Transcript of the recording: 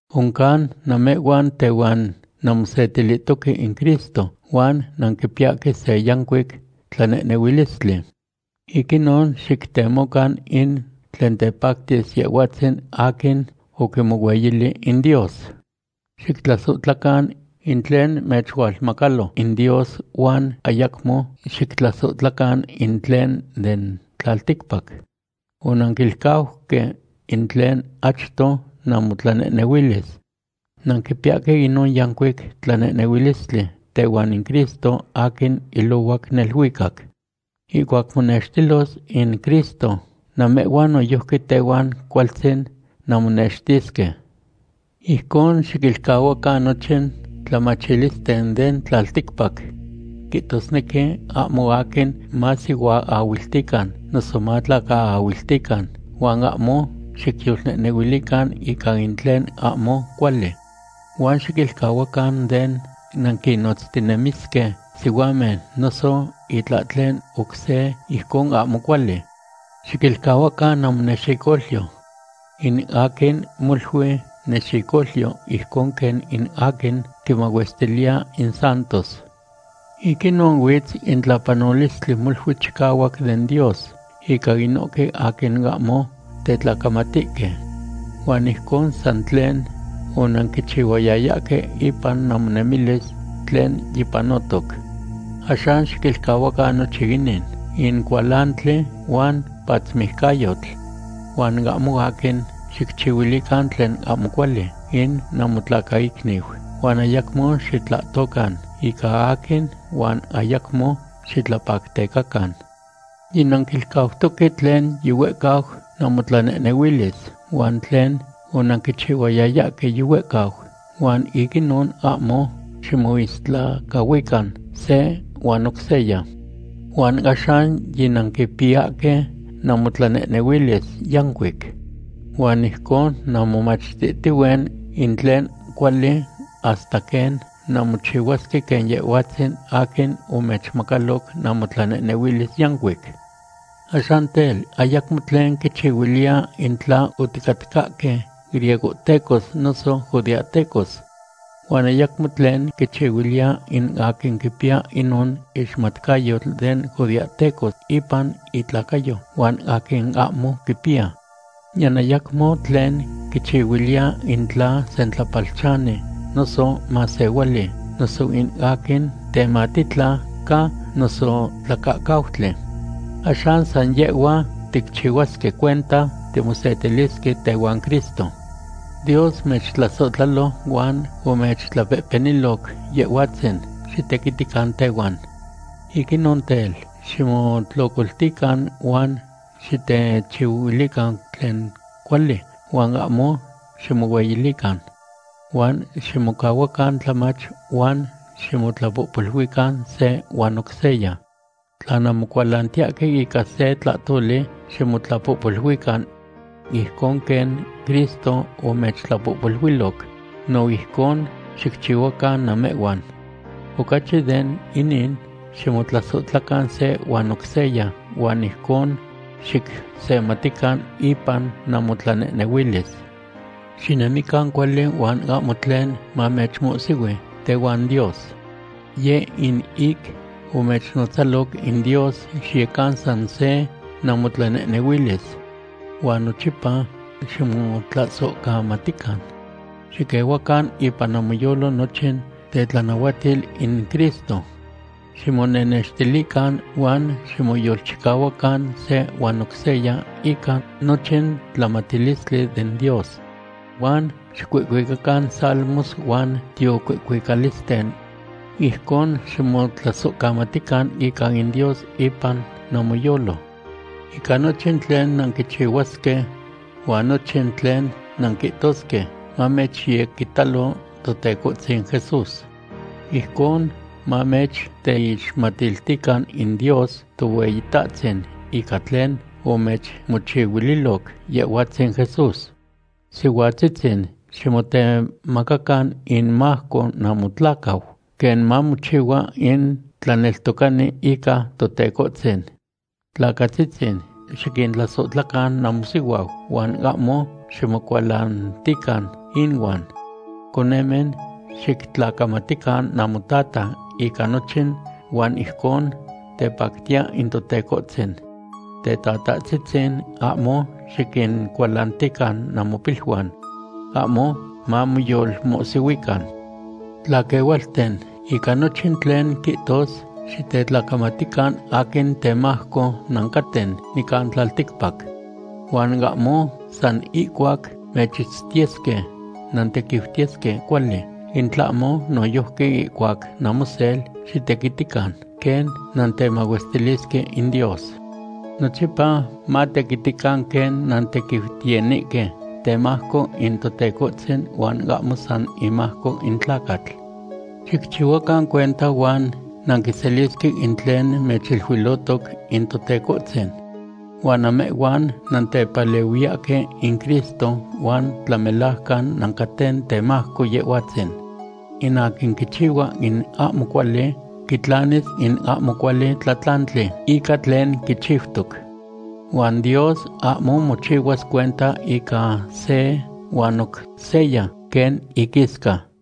Oncan namehhuan tehuan nanmosetilihtoque in Cristo huan nanquipiyahque se yancuic tlanehnehuilistli. Ic inon xictemocan in tlen tepactis Yehhuatzin aquin oquimohueyili in Dios. Xictlasohtlacan in tlen mechualmacalo in Dios huan ayacmo xictlasohtlacan in tlen den tlalticpac. Onanquilcauque in tlen achto namotlanehnehuilis. Nanquipiyahque inon yancuic tlanehnehuilistli tehuan in Cristo aquin ilohuac neluicac. Ihcuac monextilos in Cristo, namehhuan noyojqui tehuan cualtzin nanmonextisque. Ijcon, xiquilcahuacan nochin tlamatilisten den tlalticpac. Quihtosnequi ahmo aquin masihuaahuiltican noso matlacaahuiltican, huan ahmo xicyolnehnehuilican ica in tlen ahmo cuali. Huan xiquilcahuacan den nanquinotztinemisque sihuamen noso itlahtlen oc se ijcon ahmo cuali. Xiquilcahuacan namonexicolyo. In aquin molui nexicolyo ijcon quen in aquin quimahuestiliya in santos. Ic inon huitz in tlapanolistli molui chicahuac den Dios ica inohque aquin ahmo tetlacamatihque. Huan ijcon san tlen onanquichihuayayahque ipan namonemilis tlen yipanotoc. Axan xiquilcahuacan nochin inin; in cualantli, huan patzmijcayotl. Huan ahmo aquin xicchihuilican tlen ahmo cuali in namotlacaicniu, huan ayacmo xitlahtocan ica aquin, huan ayacmo xitlapactecacan. Yinanquilcautoque tlen yihuehcau namotlanehnehuilis, huan tlen onanquichihuayayahque yihuehcau, huan ic inon ahmo ximoistlacahuican se huan oc seya. Huan axan yinanquipiyahque namotlanehnehuilis yancuic. Huan ijcon nanmomachtihtihue in tlen cuali hasta quen nanmochihuasque quen Yehhuatzin aquin omechmacalo namotlanehnehuilis yancuic. Axan tel, ayacmo tlen quichihuiliya in tla oticatcahque griegohtecos noso judeahtecos. Huan ayacmo tlen quichihuiliya in aquin quipiya inon ixmatcayotl den judeahteco ipan itlacayo huan aquin ahmo quipiya. Niyan ayacmo tlen quichihuiliya in tla sentlapalchani noso masehuali, noso in aquin tematitla ca noso tlacahcautli. Axan san yehhua ticchihuasque cuenta timosetilisque tehuan Cristo. Dios mechtlasohtlalo huan omechtlapehpeniloc Yehhuatzin xitequitican tehuan. Ic inon tel, ximotlocoltican huan xitechihuilican tlen cuali huan ahmo ximohueyilican. Huan ximocahuacan tlamach huan ximotlapohpoluican se huan oc seya. Tla nanmocualantiyahque ica se tlahtoli, ximotlapohpoluican. Ijcon quen Cristo omechtlapohpoluiloc, no ijcon xicchihuacan namehhuan. Ocachi de inin, ximotlasohtlacan se huan oc seya huan ijcon xicsematican ipan namotlanehnehuilis. Xinemican cuali huan ahmo tlen mamechmohsihui tehuan Dios. Yeh in ic omechnotzaloc in Dios xiyecan san se namotlanehnehuilis. Huan nochipa ximotlasohcamatican. Xiquehuacan ipan namoyolo nochin tetlanahuatil in Cristo. Ximonenextilican huan ximoyolchicahuacan se huan oc seya ica nochin tlamatilistli den Dios. Huan xicuihcuicacan salmos huan tiocuihcuicalisten. Ijcon ximotlasohcamatican ica in Dios ipan namoyolo. Ica nochin tlen nanquichihuasque huan nochin tlen nanquihtosque mamechyequitalo Totecohtzin Jesús. Ijcon mamechteixmatiltican in Dios Tohueyitahtzin ica tlen omechmochihuililoc Yehhuatzin Jesús. Sihuatzitzin, ximotemacacan inmajco namotlacau, quen mamochihua in tlaneltocani ica Totecohtzin. Tlacatzitzin, xiquintlasohtlacan namosihuau huan ahmo ximocualantican inuan. Conemen, xictlacamatican namotata ica nochin, huan ijcon tepactiya in Totecohtzin. Tetatahtzitzin, ahmo xiquincualantican namopiluan. Ahmo mamoyolmohsihuican. Tlaquehualten, ica nochin tlen quihtos, xitetlacamatican aquin temajco nancaten nican tlalticpac. Huan ahmo san ihcuac mechitztiyesque, nantequiutiyesque cuali, in tlahmo noyojqui ihcuac namosel xitequitican quen nantemahuestilisque in Dios. Nochipa matequitican quen nantequiutiyanihque temajco in Totecohtzin huan ahmo san imajco in tlacatl. Xicchihuacan cuenta huan nanquiselisque in tlen mechiluilotoc in Totecohtzin. Huan namehhuan nantepalehuiyahque in Cristo, huan tlamelajcan nancaten temajco Yehhuatzin. In aquin quichihua in ahmo cuali quitlanis in ahmo cuali tlatlantli ica tlen quichiutoc. Huan Dios ahmo mochihuas cuenta ica se huan oc seya, quen inquisca.